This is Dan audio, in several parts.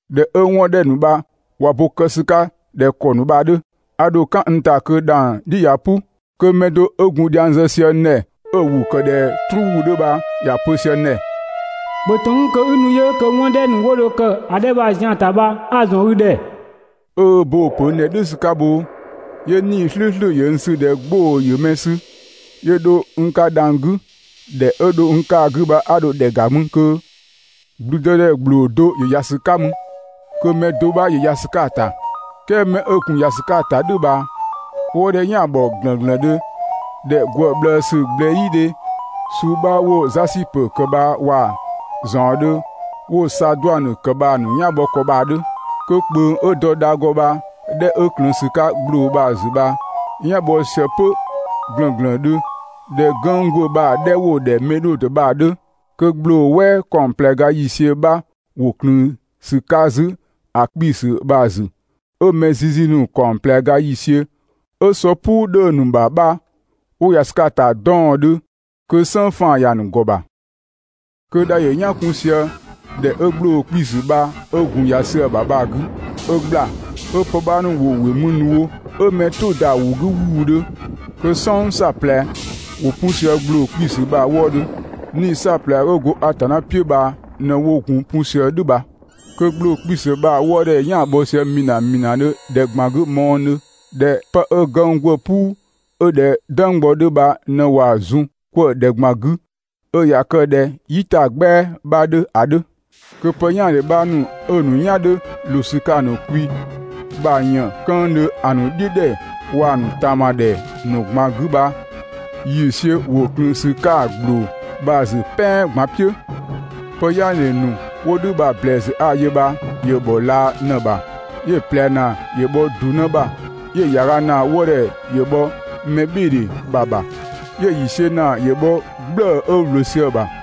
꞊Dhɛ 'ö 'wɔn 'dhɛ ‑nu bha ꞊wa bo kë ‑sü 'ka ꞊dhɛ ‑kɔ ‑nu bha‑ 'dhö, 'a dho "kan n ‑ta kö dhang‑ "dhi ꞊ya "pʋ, kö mɛ do 'ö gun dhiang zë sië n ‑dhɛ, 'ö‑ ‑wʋ ‑kë ꞊dhɛ "truu ‑wʋ 'dhö bha ‑ya pö sië n ‑dhɛ 'ö‑ pö: «‑Bhö ‑tɔn 'kun kö 'i nu yö kö 'wɔn 'dhɛ ‑nu 'wo dho kë ‑a 'dhɛ bha‑ zian‑ ‑ta bha 'a‑ ‑nu ‑zɔn i ‑dhɛ.» 'Ö ö bo‑ ‑pö n ‑dhɛ "dhʋ̈ ‑sü 'ka bhoo, 'yö 'Nii‑ "slʋ̈ʋ̈slʋ̈ ‑yö n sü ꞊dhɛ 'gbʋ‑ ‑yö mɛ sü, 'yö dho n 'ka dhang‑ 'gü. ‑Dhɛ 'ö dho n 'ka‑ 'gü bha 'a dho ‑dhɛ ‑ga mü kö ‑blüdëdhɛ ‑gbloo do ‑yö ‑ya sü 'ka mü, kö mɛ do 'bha ‑yö ‑ya ‑sü 'ka‑ ‑ta. "Kɛɛ 'mɛ 'ö gun ‑ya ‑sü 'ka‑ ‑ta "dhʋ̈ bha‑ wëëdhɛ "yan‑ ‑bhɔ ‑glënglëndhö ꞊dhɛ ‑gwë ꞊bhlëësü ꞊gblɛyidhe suu 'bha 'wo‑ Zasipö ‑kë bha waa‑ ‑zaɔndhö 'wo‑ Saaduanö ‑kë bha‑ ‑nu "yan bhɔ ‑kɔ bha‑ 'dhö. Kö ꞊kpöng 'ö dɔ dha ‑gɔ bha‑ 'dhɛ 'ö ꞊klëën ‑sü 'ka ‑gbloo bha‑ ‑zü bha‑ "yan‑ bhɔ sië 'pö ‑glënglëndhö ꞊dhɛ gënng' ‑gwë bha‑ 'dhɛ 'wo‑ ‑dhɛ Medhodö bha‑ 'dhö. Kö ‑gbloo "wɛɛ ‑kaɔng ꞊plɛ ga ‑yiisiö 'bha ‑wo ꞊klëën ‑sü 'ka 'zü ‑a 'kpiisü bha‑ ‑zü, 'ö mɛ zizi ‑nu ‑kaɔng ꞊plɛ ga ‑yiisiö 'ö sɔ "puu 'dhö‑ ‑nu ‑bha bha 'wo ‑ya ‑sü 'ka‑ ‑ta 'dɔɔndhö, kö "sënng faan‑ ‑ya ‑nu ‑gɔ ‑bha. Kö dha ‑yö "yan 'kun sië ‑dhɛ 'ö ‑gbloo 'kpiisü bha 'ö gun ‑ya sië‑ ‑bha bha‑ 'gü, 'ö ‑gbla, 'ö pë 'bha ‑nu ‑wo ‑wɩ mü ‑nu wo 'ö mɛ "tʋ‑ ‑da ‑wʋ 'gü ‑wuudhö. Kö "sɔng "saɔplɛ ‑wo 'pu sië ‑gbloo 'kpiisü bha‑ wëëdhö. 'Nii‑ "saɔplɛ 'ö go Atanna "piʋ̈ bha ꞊në 'wo gun 'pu sië "dhʋ̈ bha. Kö ‑gbloo 'kpiisü bha‑ wëëdhɛ "yan‑ bhɔ sië ‑mina ‑minadhö ‑dhɛ ꞊gban 'gü mɔɔdhö ꞊dhɛ 'pë 'ö gënng' ‑gwë "puu 'ö ꞊dhɛ "dënggbɔ 'dhö bha ꞊në ꞊waa‑ zun 'kwëë‑ ‑dhɛ ꞊gban 'gü 'ö ꞊ya kë ꞊dhɛ "yitagbɛa 'bha 'dhö ‑a 'dhö. Kö pë "yaandhe 'bha ‑nu 'ö‑ ‑nu "yan 'dhö ꞊loo ‑sü 'ka‑ ‑nu kwi ‑bha ‑yëën 'këëndhö ‑a ‑nu "dhiʋ̈ ‑dhɛ waa‑ ‑nu ꞊taama ‑dhɛ ‑nu ꞊gban 'gü bha‑ ‑yiisiö ‑wo ꞊klëën ‑sü 'ka ‑gbloo bha‑ ‑zü "pɛan ꞊gban "piʋ̈. Pë "yaandhe ‑nu 'wo "dhʋ̈ bha‑ ‑blɛɛsü 'a‑ yö bha ‑yö ‑bhɔ laa ꞊në‑ ‑bha. 'Yö‑ ꞊plɛ ‑naa ‑yö bhɔ ‑du 'në ‑bha. 'Yö‑ ‑yaaga ‑naa wëëdhɛ ‑yö bhɔ mɛbhɩɩdhe ‑bha ‑bha. 'Yö‑ ‑yiisiö ‑naa ‑yö bhɔ "gblëë‑ 'ö ‑wlö sië‑ ‑bha.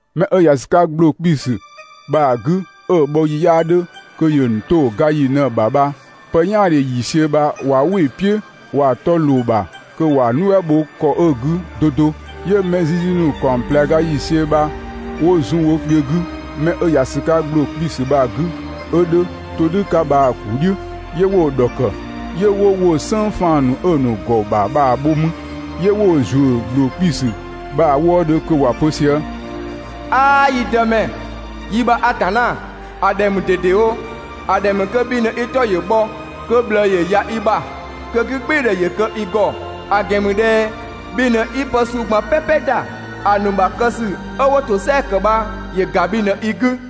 'Mɛ 'ö ‑ya ‑sü 'ka ‑gbloo 'kpiisü bha‑ 'gü 'ö‑ bhɔ ‑yi 'yaa 'dhö kö yöö ‑nu 'to ga ‑yi ꞊në‑ ‑bha bha, pë "yaandhe ‑yiisiö bha ꞊wa "wɩ‑ "piʋ̈, ꞊wa 'tɔ ꞊loo‑ ‑bha kö ‑wa nuɛ" bho ‑kɔ 'ö‑ 'gü 'do 'do, 'Yö mɛ zizi ‑nu ‑kaɔng ꞊plɛ ga ‑yiisiö bha 'wo zun wo kpiö 'gü 'mɛ 'ö ‑ya ‑sü 'ka ‑gbloo 'kpii‑ bha‑ 'gü, 'ö 'dhö ‑todhʋ̈ 'ka bha‑ ‑kuu "dhiʋ̈, 'yö 'wo‑ ‑dhɔkë. 'Yö 'wo woo‑ "sënng 'faan‑ ‑nu 'ö‑ ‑nu ‑gɔ ‑bha bha‑ bho mü 'yö 'wo‑ ‑zuö ‑gbloo 'kpiisü bha‑ wëëdhö kö ‑wa pö sië: «'Aa! Yi Dëmɛ, yi ‑bha Atanna, ‑a ‑dhɛ ‑mü ꞊dedewo. ‑A ‑dhɛ ‑mü kö bhi ꞊në i 'tɔ ‑yö bhɔ, kö ꞊bhlëë ‑yö ‑ya i ‑bha, kö 'gügbɩɩdhɛ ‑yö kë i ‑gɔ. ‑A ‑gɛn ‑mü ꞊dhɛ bhi ꞊në 'i pë suu ꞊gban "pɛpɛ ‑da. ‑A ‑nu ‑bha kë ‑sü 'ö 'wo ‑tosɛa ‑kë bha ‑yö ‑ga bhi ꞊në i 'gü.»